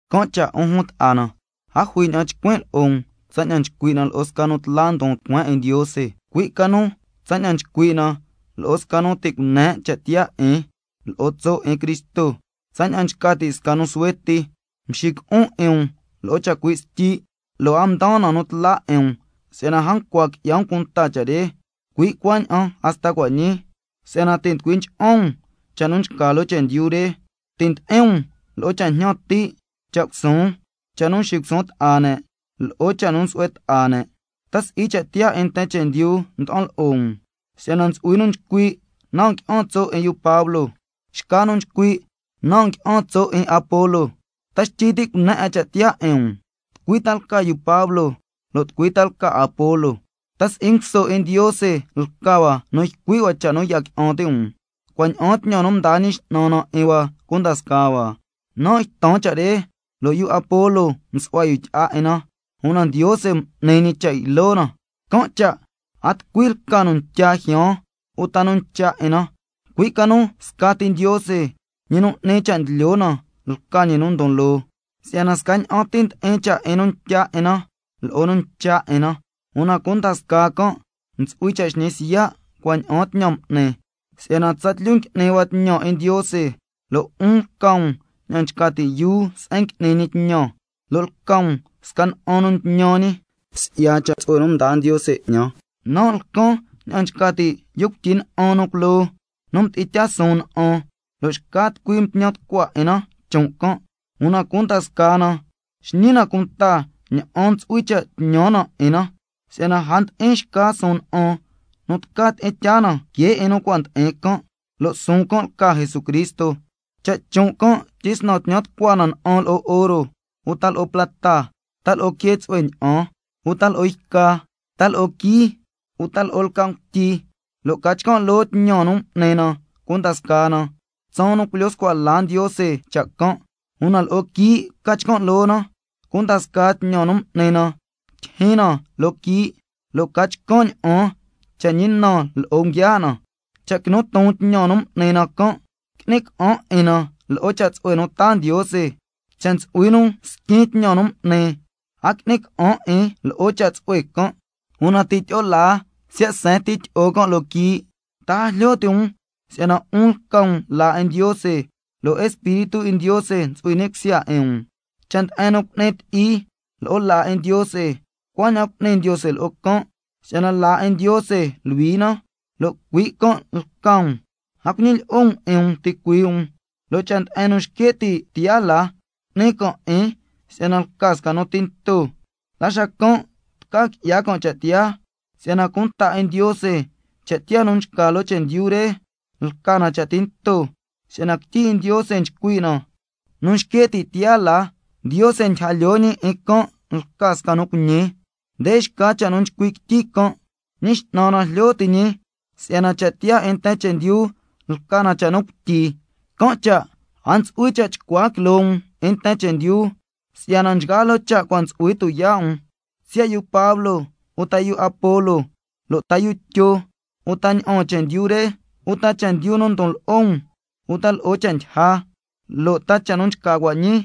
Can' cha' 'un jun ta'a na, a jui ña'an chcuin' lo'o um tsaña'an nchcui' na lo'o sca nu tla ndon tucueen 'in Ndiose, cui' ca nu tsaña'an nchcui' na lo'o sca nu ti' cune' cha' tiyaa 'in lo'o tso' 'in Cristo, tsaña'an nchca ti' sca nu suhue ti. Mxico'on 'in um lo'o chacui' styi', lo' a mdaan na nu tla 'in um, si'yana a ncua qui'ya um cunta cha' re, cui' cuaña'an hasta cua' ñii, si'yana ti' nducui ncha'an um cha' nu nchca loo chendyu re, ti' ndi'in lo'o um cha' jñan ti', cha' cusuun, cha' nu nxisuun ta'a ne', lo'o cha' nu nsu'hue ta'a ne'. ¿Ta si'i cha' tiyaa 'in nten chendyu nda'an lo'o um? Si'yana ntsu'hui nu nchcui': Nan' ngui'an tso' 'in yu Pablo, xca nu nchcui': Nan' ngui'an tso' 'in Apolo. ¿Ta xtyi ti' cune' 'a cha' tiyaa 'in um? ¿Tucui ta lca yu Pablo, lo' tucui lca Apolo? ¿Ta si'i nguso 'in Ndiose lca hua nu ycui' cha' nu ya qui'an ti' um, cua' ña'aan tñan nu mdaa Ñi X'nan na 'in hua cunda scaa hua? Nan' ytan cha' re, lo' yu Apolo msu'hua yu tyi'a 'in na, una Ndiose m'ni ñi cha' ylo na. Can' cha' a tucui lca nu ntya jyaan uta nu ncha' 'in na, cui' ca nu scati Ndiose, ñi nu n'ni cha' ndlyo na lca ñi nu ndon loo. Si'yana scaña'an ti ndi'in cha' 'in nu ntya 'in na lo'o nu ncha' 'in na, una cunda scaa can' ntsu'hui cha' xñi siya' cua' ña'aan tñan m'ni. Si'yana tsatlyu ngui'ni hua tñan 'in Ndiose, lo' 'un lca um ña'an nchca ti' yuu se'en ngui'ni ñi tñan, lo' lca um sca na'an nu ntñan ñi. Si'ya cha' tsu'hue 'in Ndiose nu cua' mdaa ñi 'ñan, nan' lcan ña'an nchca ti' yu cuityi na'an nu culoo, nu mdi'in tyaa suun na'an, lo' xca tucui ntñan tucua 'in na chon' can', una cunda scaa na xñi na cunta ña'an ntsu'hui cha' tñan na 'in na. Si'yana a ndi'in xca suun na'an nu tca tyi'in tyaa na que 'in nu cua' ndi'in can', lo' suun can' lca Jesucristo. Cha' chon' can' tyisnan tñan tucua na na'an lo'o oro, uta lo'o plata, ta lo'o quee tsu'hue ña'an, uta lo'o yca, ta lo'o quií, uta lo'o lca' ngutyi, lo' ca chcan' loo tñan nu m'ni na cunda scaa na, tsaan nu culyo scua la Ndiose cha' can', una lo'o quii' ca chcan' loo na, cunda scaa tñan nu m'ni na tyijyin na loo quii', xacan' ca chcan' ña'an cha' ñi na lo'o nguiaa' na. Cha' quinu ton tñan nu m'ni na can', qui'ni ca'an 'in na lo'o cha' tsu'hue nu taa Ndiose. Cha' ntsu'hui nu squin tñan nu m'ni, a qui'ni ca'an 'in lo'o cha' tsu'hue can', una ti' tyi'o laa siya' seen ti tyi'o can' loo quii'. ¿Ta a jlyo ti' um si'yana 'un lca um laa 'in Ndiose, lo' Espíritu 'in Ndiose ntsu'hui ni' cusya 'in um? Cha' nde'en nu cu'ni ti'i lo'o laa 'in Ndiose, cuaña'an cu'ni Ndiose lo'o can', si'yana laa 'in Ndiose luhui na, lo' cui' can' lca um. A cuñilyi'o um 'in um ticuii' um, lo' cha' nde'en nu xque' ti' tiyaa la ntsu'hui lja um, cu'ni can' 'in si'yana lca sca nu tinto, la xacan' tca qui'ya can' cha' tiyaa. Si'yana cunta 'in Ndiose, cha' tiyaa nu nchca loo chendyu re lca na cha' tinto, si'yana quityi 'in Ndiose nchcui' na: Nu nxque' ti' tiyaa la, Ndiose ndyija lyoo ñi 'in can' lca sca nu cuiñi. Nde xca cha' nu nchcui' quityi can': Ñi X'nan na jlyo ti' ñi si'yana cha' tiyaa 'in nten chendyu lca na cha' nu cuityi, can' cha' a ntsu'hui cha' chcua quiloo um 'in nten chendyu, si'yana nchgaa loo cha' cua' ntsu'hui tuyaa' um, siya' yu Pablo, uta yu Apolo, lo' ta yu Tyo, uta ña'aan chendyu re, uta chendyu nu ndon lo'o um, uta lo'o cha' ndyija, lo' ta cha' nu nchca cua' ñii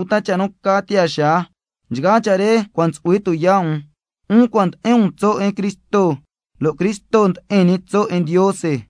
uta cha' nu ca tiyaa xaa, nchgaa cha' re cua' ntsu'hui tuyaa' um, 'un cua' ndi'in um tso' 'in Cristo, lo' Cristo ndi'in ñi tso' 'in Ndiose.